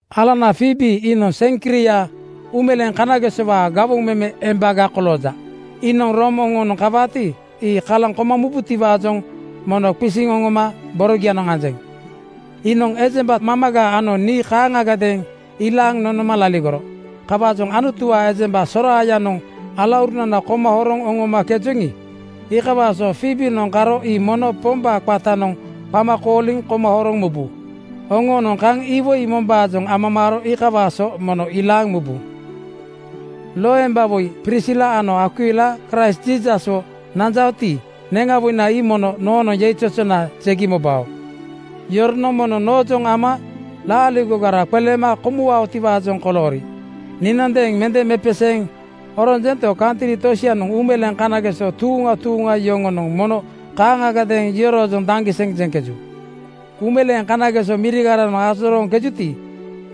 Alanana Fiibi (Foibe) iinoŋ Seŋkria uumeleeŋ kanagesowaa gawoŋ meme embaga kolooja. Iinoŋ Room oŋoonoŋ kawaati, ii kalaŋ kombutiwaajoŋ mono qisiŋ oŋoma borogianoŋ anjeŋ. Iinoŋ ejemba mamaga ano nii kaaŋagadeeŋ ilaaŋ nonoma laligoro. Kawaajoŋ Anutuwaa ejemba soraayanoŋ alaurunana koma horoŋ oŋomakejoŋi, iikawaa so Fiibinoŋ karo ii mono Pombaa qatanoŋ qama kooliŋ koma horoŋ mubu. Oŋoonoŋ kaŋ iwoi mombaajoŋ amamaaro iikawaa so mono ilaaŋ mubu. Loembawoi Prisila ano Akwila Kraist Jiisaswo nanjaoti, neŋawoina ii mono noonoŋ yeizozona jegi mobao. Yoronoŋ mono noojoŋ ama laaligogara qeleema komuwaotiwaajoŋ koloori. Niinoŋadeeŋ mende mepeseeŋ oronjento, kantri tosianoŋ uumeleeŋ kanageso tuuŋa tuuŋa yoŋonoŋ mono kaaŋagadeeŋ yoroojoŋ daŋgiseŋ jeŋkeju. Uumeleeŋ kanageso mirigaranoŋ ajorooŋkejuti,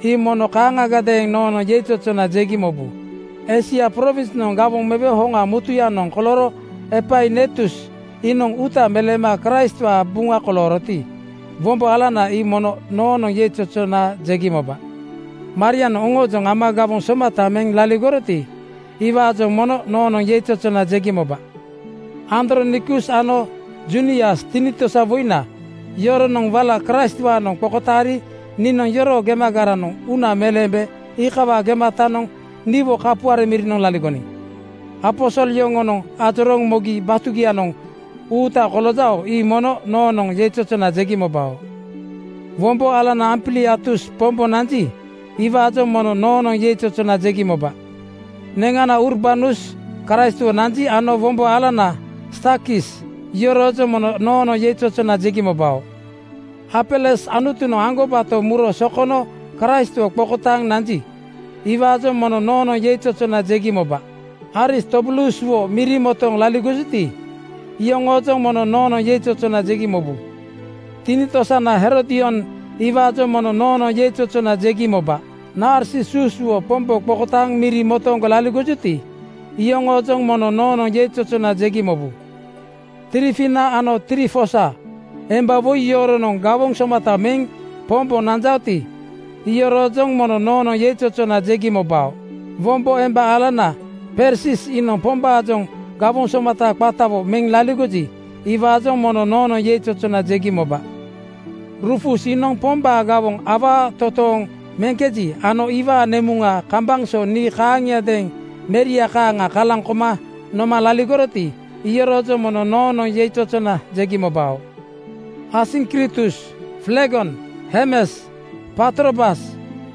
ii mono kaaŋagadeeŋ noonoŋ yeizozona jegi mobu. Eisia prowinsnoŋ gawoŋ mewe hoŋa mutuyanoŋ kolooro Epainetus iinoŋ uuta meleema Kraistwaa buŋa kolooroti, wombo alana ii mono noonoŋ yeizozona jegi moba. Marianoŋ oŋoojoŋ ama gawoŋ somata meŋ laligoroti, iwaajoŋ mono noonoŋ yeizozona jegi moba. Andronikus ano Junias tinitosawoina yoronoŋ wala Kraistwaanoŋ qokotaari niinoŋ yoroo gemagaranoŋ uuna meleembe iikawaa gematanoŋ niwo kapuare mirinoŋ laligoniŋ. Aposol yoŋonoŋ oroojoŋ mogi batugianoŋ uuta koloojao. Ii mono noonoŋ yeizozona jegi mobao. Wombo alana Ampliatus Pombo nanji, iwaajoŋ mono noonoŋ yeizozona jegi moba. Neŋanana Urbanus Kraistwo nanji ano wombo alana Stakis yoroojoŋ mono noonoŋ yeizozona jegi mobao. Apeles Anutunoŋ aŋgobato muro sokono Kraistwo qokotaaŋ nanji, iwaajoŋ mono noonoŋ yeizozona jegi moba. Aristobuluswo miri motooŋ laligojuti, iyoŋoojoŋ mono noonoŋ yeizozona jegi mobu. Tinitosana Herodion iwaajoŋ mono noonoŋ yeizozona jegi moba. Narsisuswo Pombo qokotaaŋ miri motooŋgo laligojuti, iyoŋoojoŋ mono noonoŋ yeizozona jegi mobu. Trifina ano Trifosa emba woi yoronoŋ gawoŋ somata meŋ Pombo nanjaoti, iyoroojoŋ mono noonoŋ yeizozona jegi mobao. Wombo emba alana Persis iinoŋ Pombaajoŋ gawoŋ somata qatawo meŋ laligoji, iwaajoŋ mono noonoŋ yeizozona jegi moba. Rufus iinoŋ Pombaa gawoŋ awaa totooŋ meŋkeji ano iwaa nemuŋa kambaŋ so nii kaaŋiadeeŋ meria kaaŋa kalaŋ koma noma laligoroti, iyoroojoŋ mono noonoŋ yeizozona jegi mobao. Asiŋkritus, Flegon, Hermes, Patrobas,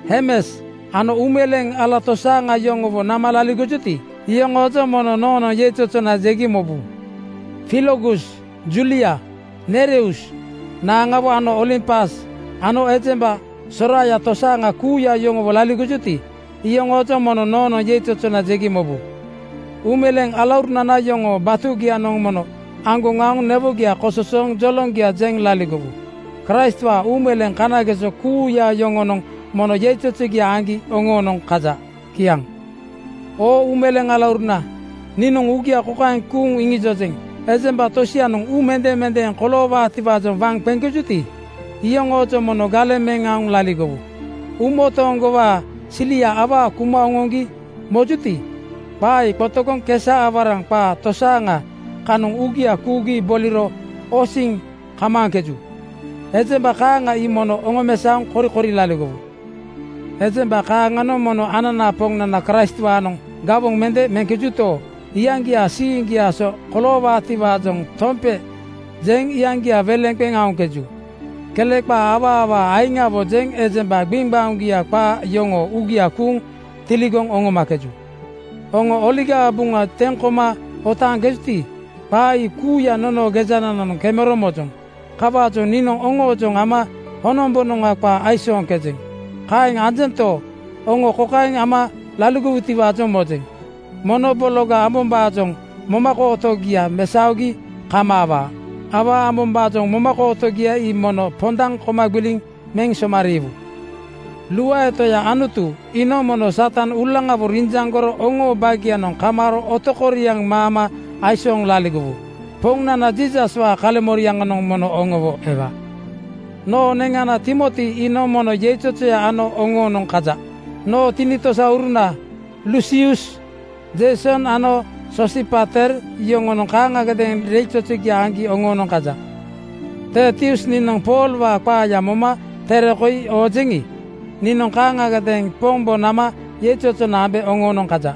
Hermas ano uumeleeŋ ala tosaaŋa yoŋowo nama laligojuti, iyoŋoojoŋ mono noonoŋ yeizozona jegi mobu. Filologus, Julia, Nereus naaŋawo ano Olimpas ano ejemba soraaya tosaaŋa kuuya yoŋowo laligojuti, iyoŋoojoŋ mono noonoŋ yeizozona jegi mobu. Uumeleeŋ alaurunana yoŋoo batugianoŋ mono aŋgoŋ aoŋ newogia kososooŋ joloŋgia jeŋ laligowu. Kraistwaa uumeleeŋ kana-geso kuuya yoŋonoŋ mono yeizozogia aŋgi oŋoonoŋ kaja. Kiaŋ. Oo uumeleeŋ alauruna, niinoŋ uugia kokaeŋ kuuŋ iŋijojeŋ: Ejemba tosianoŋ uu mendemendeeŋ koloowaatiwaajoŋ waŋ qeŋkejuti, iyoŋoojoŋ mono galeŋ meŋ aoŋ laligowu. Uumotooŋgowaa silia awaa kuma oŋoŋgi mojuto, qaa ii qotogoŋ kesa-awaraŋ qaa tosaaŋa kanoŋ uugia kuugi boliro osiŋ kamaaŋkeju. Ejemba kaaŋa ii mono oŋomesaoŋ korikori laligowu. Ejemba kaaŋanoŋ mono ananaa Poŋnana Kraistwaanoŋ gawoŋ mende meŋkejuto, iyaŋgiaa siiŋgiaa so koloowaatiwaajoŋ tompe jeŋ iyaŋgia weleŋ qeŋ aoŋkeju. Kele qaa awaa awaa aiŋawo jeŋ ejemba gbiŋgbaoŋgia qaa yoŋoo uugia kuuŋ tiligoŋ oŋomakeju. Oŋo Oligaa Buŋa teŋ koma otaaŋkejuti, qaa ii kuuya nonoo gejanananoŋ kemero mojoŋ. Kawaajoŋ niinoŋ oŋoojoŋ ama honombonoŋa qaa aisooŋkejeŋ. Kaeŋ anjento, oŋo kokaeŋ ama laligowutiwaajoŋ mojeŋ: Mono bologa ambombaajoŋ momakootogia mesaogi kamaawaa. Awaa ambombaajoŋ momakootogia ii mono pondaŋ koma gbiliŋ meŋ somariiwu. Luae Toya Anutu iinoŋ mono Satan uulaŋawo rinjaŋgoro oŋoo baagianoŋ kamaaro otokoriaŋ maama aisooŋ laligowu. Poŋnana Jiisaswaa kaleŋmoriaŋanoŋ mono oŋowo ewa. Noo neŋana Timoti iinoŋ mono yeizozoya ano oŋoonoŋ kaja. Noo tinitosauruna Lusius, Jeison ano Soosipater yoŋonoŋ kaaŋagadeeŋ yeizozogia aŋgi oŋoonoŋ kaja. Tertius niinoŋ Poolwaa qaaya moma tere koi oojeŋi, niinoŋ kaaŋagadeeŋ Pombo nama yeizozona ambe oŋoonoŋ kaja.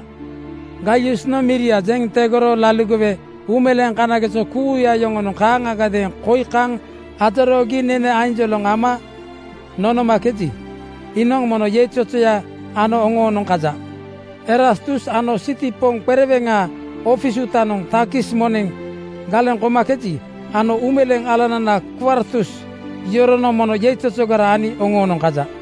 Gaiusnoŋ miria jeŋ tegoro laligowe uumeleeŋ kanageso kuuya yoŋonoŋ kaaŋagadeeŋ koi kaŋ ajoroogi nene ainjoloŋ ama nonomakeji, iinoŋ mono yeizozoya ano oŋoonoŋ kaja. Erastus iinoŋ siti poŋ qereweŋaa ofis uutanoŋ takis moneŋ galeŋ komakeji ano uumeleeŋ alanana Kwartus yoronoŋ mono yeizozogara ani oŋoonoŋ kaja.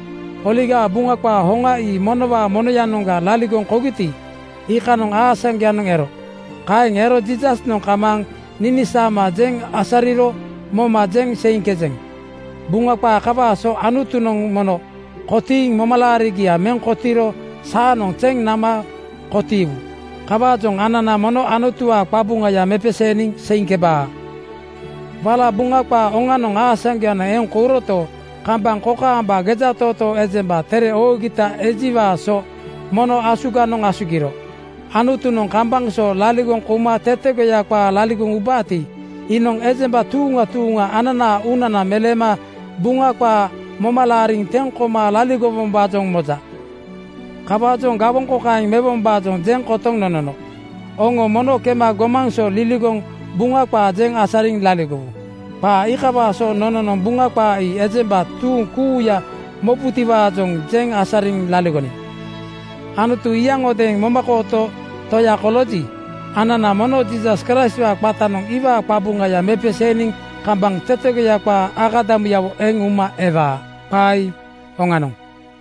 Oligaa Buŋa qaa hoŋa ii monowaa monoyanoŋga laligoŋ kougiti, iikanoŋ aasaŋgoyanoŋ ero. Kaeŋ ero Jiisasnoŋ kamaaŋ ninisaama jeŋ asariro moma jeŋ seiŋkejeŋ. Buŋa qaa kawaa so Anutunoŋ mono kotiiŋ momalaarigia meŋ kotiiro saanoŋ zeŋ nama kotiiwu. Kawaajoŋ anana mono Anutuwaa qabuŋaya mepeseeniŋ seiŋkebaa. Wala Buŋa qaa oŋanoŋ aasaŋgoyanoŋ eŋ kouroto, kambaŋ kokaamba gejatootoo ejemba tere oogita ejiwaa so mono asuganoŋ asugiro. Anutunoŋ kambaŋ so laligoŋ kouma tetegoya qaa laligoŋ ubaati, iinoŋ ejemba tuuŋa tuuŋa anana uunana meleema Buŋa qaa moma laariŋ teŋ koma laligowombaajoŋ moja. Kawaajoŋ gawoŋ kokaeŋ mewombaajoŋ jeŋ kotoŋ nonono, “Oŋo mono kema gomaŋ so liligoŋ Buŋa qaa jeŋ asariŋ laligowu.” Qaa iikawaa so nononoŋ Buŋa qaa ii ejemba tuuŋ kuuya mobutiwaajoŋ jeŋ asariŋ laligoniŋ. Anutu iyaŋodeeŋ momakooto Toya kolooji, anana mono Jiisas Kraistwaa qatanoŋ iwaa qabuŋaya mepeseeniŋ kambaŋ tetegoya qaa akadamuyawo eŋ uma ewaa. Qaa ii oŋanoŋ.